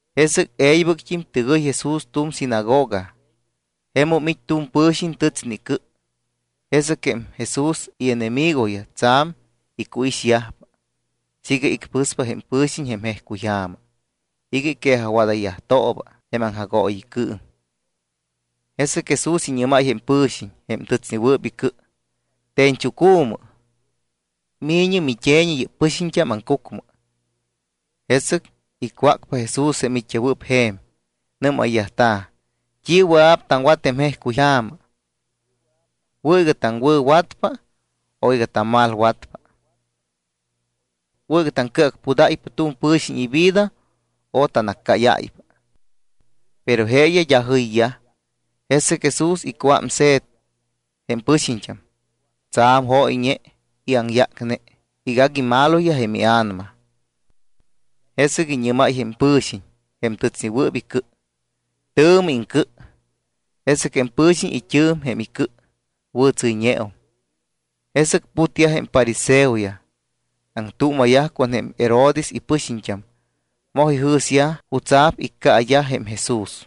Jesɨc e̱ybɨct́im tɨgɨy Jesús tu̱m sinagoga. Jemum it́ tu̱m pɨ̱xiñ tɨtsne icɨ. Jesɨc jém Jesús ienemigoyaj tsa̱m icuixyajpa siiga icpɨspa jém pɨ̱xiñ jém jejcuyja̱ma iga iquejajwadayyajtooba jém aŋjagooyicɨɨm. Jesɨc Jesús iñɨ́máy jém pɨ̱xiñ jém tɨtsnewɨɨp icɨ: —Te̱ñchucu̱mɨ. Mi̱ñɨ mit́e̱ñi yɨ́p pɨxiñt́am aŋcucmɨ. Jesɨc icwácpa Jesús jém it́yajwɨɨp je̱m. Nɨ́mayyajta̱: —¿T́i wɨa̱p taŋwat jém jejcuyja̱ma? ¿Wɨ̱ iga taŋwɨ̱watpa o iga tammalwatpa? ¿Wɨ̱ iga taŋcɨacpudáypa tu̱m pɨ̱xiñ ivida o tannaccáyáypa? Pero jeeyaj d́a jɨyyaj. Jesɨc Jesús icuámse̱t jém pɨxiñt́am, tsa̱m jóyñe y aŋyácne iga agui maloyaj jém ia̱nama. Jesɨc iñɨ́máy jém pɨ̱xiñ, jém tɨtsnewɨɨp icɨ: —Tɨ̱mɨ iŋcɨ. Jesɨc jém pɨ̱xiñ it́ɨ̱m jém icɨ, wɨ̱tsɨ́yñeum. Jesɨc putyaj jém fariseoyaj. Aŋtuuma̱yaj con jém Herodes ipɨxiñt́am, moj ijɨ̱syaj jutsa̱p iccaayaj jém Jesús.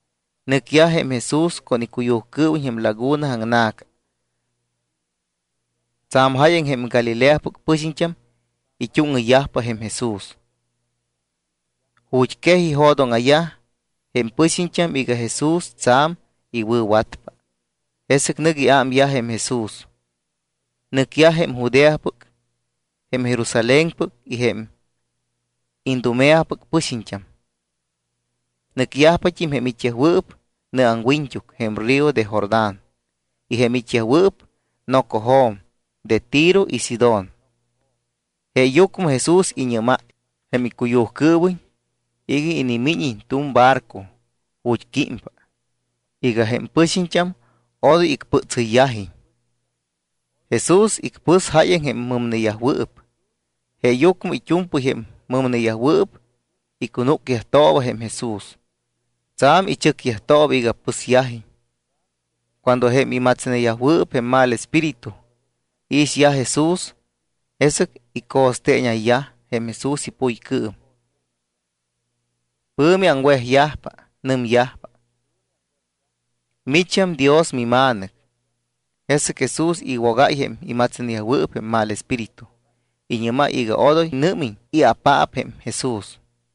Nɨcyaj jém Jesús con icuyujcɨɨwiñ jém laguna aŋna̱ca. Tsa̱m jáyaŋ jém Galileapɨc pɨxiñt́am it́úŋɨyyajpa Jesús. Ju̱t́ quej ijo̱dóŋa̱yaj jém pɨxiñt́am iga Jesús tsa̱m iwɨ̱watpa. Jesɨc nɨc iámyaj jém Jesús. Nɨcyaj jém Judeapɨc, jém Jerusalénpɨc y jém Idumeapɨc pɨxiñt́am. Nɨcyajpat́im jém it́yajwɨɨp nɨ aŋwiñt́uc jém río de Jordán y jém it́yajwɨɨp nocojo̱m de Tiro y Sidón. Jeeyucmɨ Jesús iñɨ́máy jém icuyujcɨɨwiñ iga inimíñiñ tu̱m barco ju̱t́ químpa iga jém pɨxiñt́am odoy icpɨtsɨyyajiñ. Jesús icpɨs jáyaŋ jém mɨmneyajwɨɨp. Jeeyucmɨ it́u̱mpɨy jém mɨmneyajwɨɨp icunúcyajtooba Jesús. Tsa̱m ichɨcyajtooba iga pɨsyajiñ. Cuando jém imatsneyajwɨɨp jém mal espíritu iixyaj Jesús, jesɨc ico̱steeñayyaj jém Jesús ipuycɨɨm, pɨ̱mi aŋwejyajpa. Nɨmyajpa: —¡Micham Dios miMa̱nɨc! Jesɨc Jesús iwogáypa jém imatsneyajwɨɨp jém mal espíritu. Iñɨ́máy iga odoy nɨ́miñ i̱apaap jém Jesús.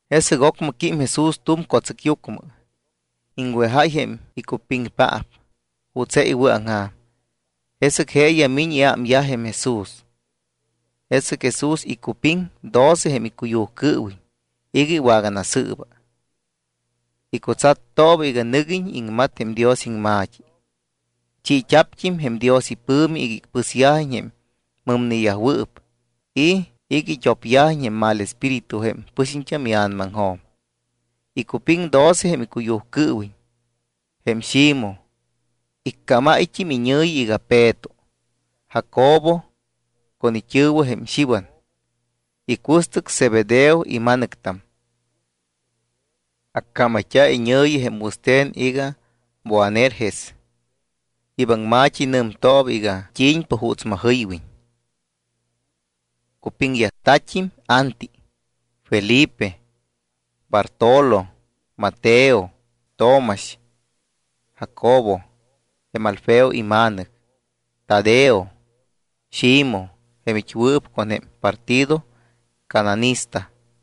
Jesɨc ocmɨ quím Jesús tu̱m co̱tsɨcyucmɨ. Iŋwejáy jém icupiŋpaap juuts je iwɨ̱aŋja̱m. Jesɨc jeeyaj miñ iámyaj jém Jesús. Jesɨc Jesús icupiŋ doce jém icuyujcɨɨwiñ iga iwaganasɨɨba. Icutsattooba iga nɨguiñ iŋmat jém Dios iŋma̱t́i. Chiit́a̱pt́im jém Dios ipɨ̱mi iga icpɨsyajiñ jém mɨmneyajwɨɨp y iga it́opyajiñ jém mal espíritu jém pɨxiñt́am ia̱namaŋjo̱m. Icupiŋ doce jém icuyujcɨɨwiñ: jém Ximoj, iccámáyt́im iñɨ̱yi iga Peto; Jacobo, con it́ɨ̱wɨ jém Xiwan, icuɨstɨc Zebedeo ima̱nɨctam, accámayt́a̱ iñɨ̱yi jém wɨste̱n iga Boanerges, yɨ́p aŋma̱t́i nɨmtooba iga t́i̱ñpa juuts majɨywiñ. Cupiŋyajta̱t́im Anti; Felipe; Bartolo; Mateo; Tomax; Jacobo, jém Alfeo ima̱nɨc; Tadeo; Ximoj, jém it́wɨɨp con jém partido cananista;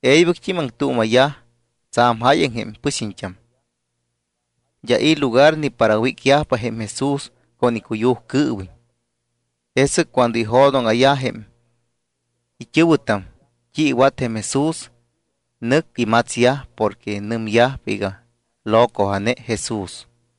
E̱ybɨct́im aŋtuuma̱yaj tsa̱m jáyaŋ jém pɨxiñt́am. D́a i̱ lugar ni para wícyajpa jém Jesús con icuyujcɨɨwiñ. Jesɨc cuando ijo̱dóŋa̱yaj jém it́ɨ̱wɨtam t́i iwat jém Jesús, nɨc imatsyaj porque nɨmyajpa iga locoja̱ne Jesús.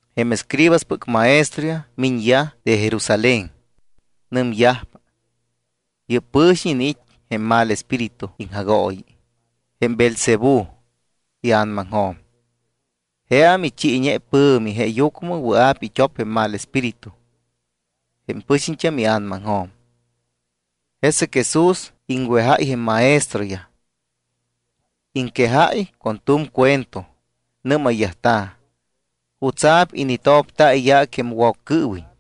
Jém escribaspɨc maestroyaj miñyaj de Jerusalén. Nɨmyajpa: —Yɨ́p pɨ̱xiñ iniit́ jém mal espíritu iŋjagooyi, jém Beelzebú, ia̱namaŋjo̱m. Jeam ichi ipɨ̱mi, jeeyucmɨ wɨa̱p it́op jém mal espíritu jém pɨxiñt́am ia̱namaŋjo̱m. Jesɨc Jesús iŋwejáy jém maestroyaj. Iŋquejáy con tu̱m cuento. Nɨ́mayyajta̱: —¿Jutsa̱p initopta̱ iyaac jém Woccɨɨwiñ?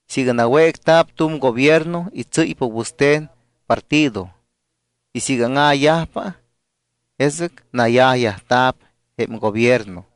Siiga nawécta̱p tu̱m gobierno y tsɨ́ypa wɨste̱n partido, y siiga áŋa̱yajpa, jesɨc nayajyajta̱p jém gobierno.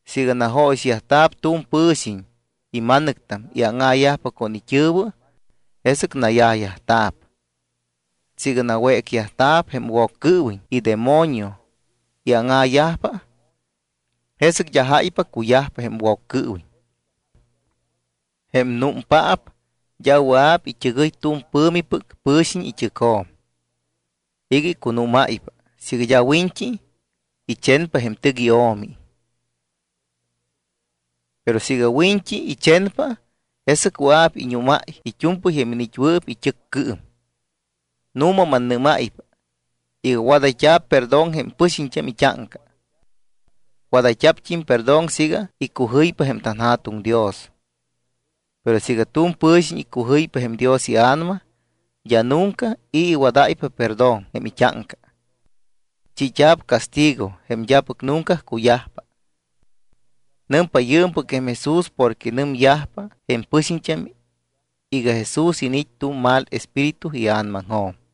Siiga najóyixyajta̱p tu̱m pɨ̱xiñ ima̱nɨctam y áŋa̱yajpa con it́ɨ̱wɨ, jesɨc nayajyajta̱p. Siiga nawécyajta̱p jém Woccɨɨwiñ idemonio y áŋa̱yajpa, jesɨc d́a jáypa cuyajpa jém Woccɨɨwiñ. ’Jém númpaap d́a wɨa̱p it́ɨgɨy tu̱m pɨ̱mipɨc pɨ̱xiñ it́ɨcjo̱m iga icunúmáypa siiga d́a wiñt́i ichenpa jém tɨc io̱mi. Pero siiga wiñt́i ichenpa, jesɨc wɨa̱p iñúmáy it́u̱mpɨy jém iniit́wɨɨp it́ɨccɨɨm. ’Nu̱ma mannɨ́máypa iga wadayt́a̱p perdón jém pɨxiñt́am it́áŋca. Wadayt́a̱pt́im perdón siiga icujɨypa jém tanJa̱tuŋ Dios, pero siiga tu̱m pɨ̱xiñ icujɨypa jém Dios iA̱nama, d́a nunca i̱ iwadáypa perdón jém it́áŋca. Chiit́a̱p castigo jém d́apɨc nunca cuyajpa. Nɨmpa yɨɨmpɨc jém Jesús porque nɨmyajpa jém pɨxiñt́am iga Jesús iniit́ tu̱m mal espíritu ia̱namaŋjo̱m.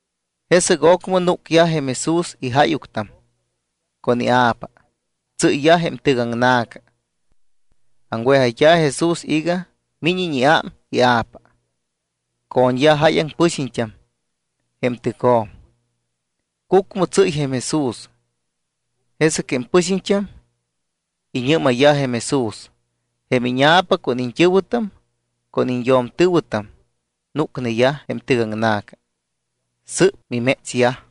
Jesɨc ocmɨ núcyaj jém Jesús ijáyuctam con ia̱pa. Tsɨ́yyaj jém tɨc aŋna̱ca. Aŋwejayt́a̱ Jesús iga míñiñ iám ia̱pa. Co̱ñyaj jáyaŋ pɨxiñt́am jém tɨcjo̱m. Cucmɨ tsɨ́y jém Jesús. Jesɨc jém pɨxiñt́am iñɨ́mayyaj jém Jesús: —Jém íña̱pa con iñt́ɨ̱wɨtam con iñyo̱mtɨ̱wɨtam núcneyaj jém tɨgaŋna̱ca. Sɨ́p mimétsyaj.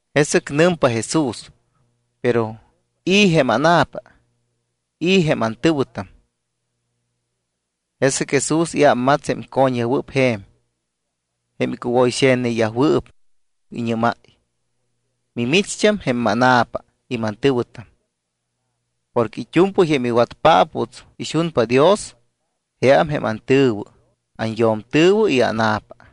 Jesɨc nɨmpa Jesús: —¿Pero i̱ jém ána̱pa, i̱ jém antɨ̱wɨtam? Jesɨc Jesús iámmats jém co̱ñyajwɨɨp je̱m, jém icuwoyxe̱tneyajwɨɨp. Iñɨ́máy: —Mimicht́am jém mána̱pa y mantɨ̱wɨtam. Porque it́u̱mpɨy jém iwatpaap juuts ixunpa Dios, jeam jém antɨ̱wɨ, anyo̱mtɨ̱wɨ y ána̱pa.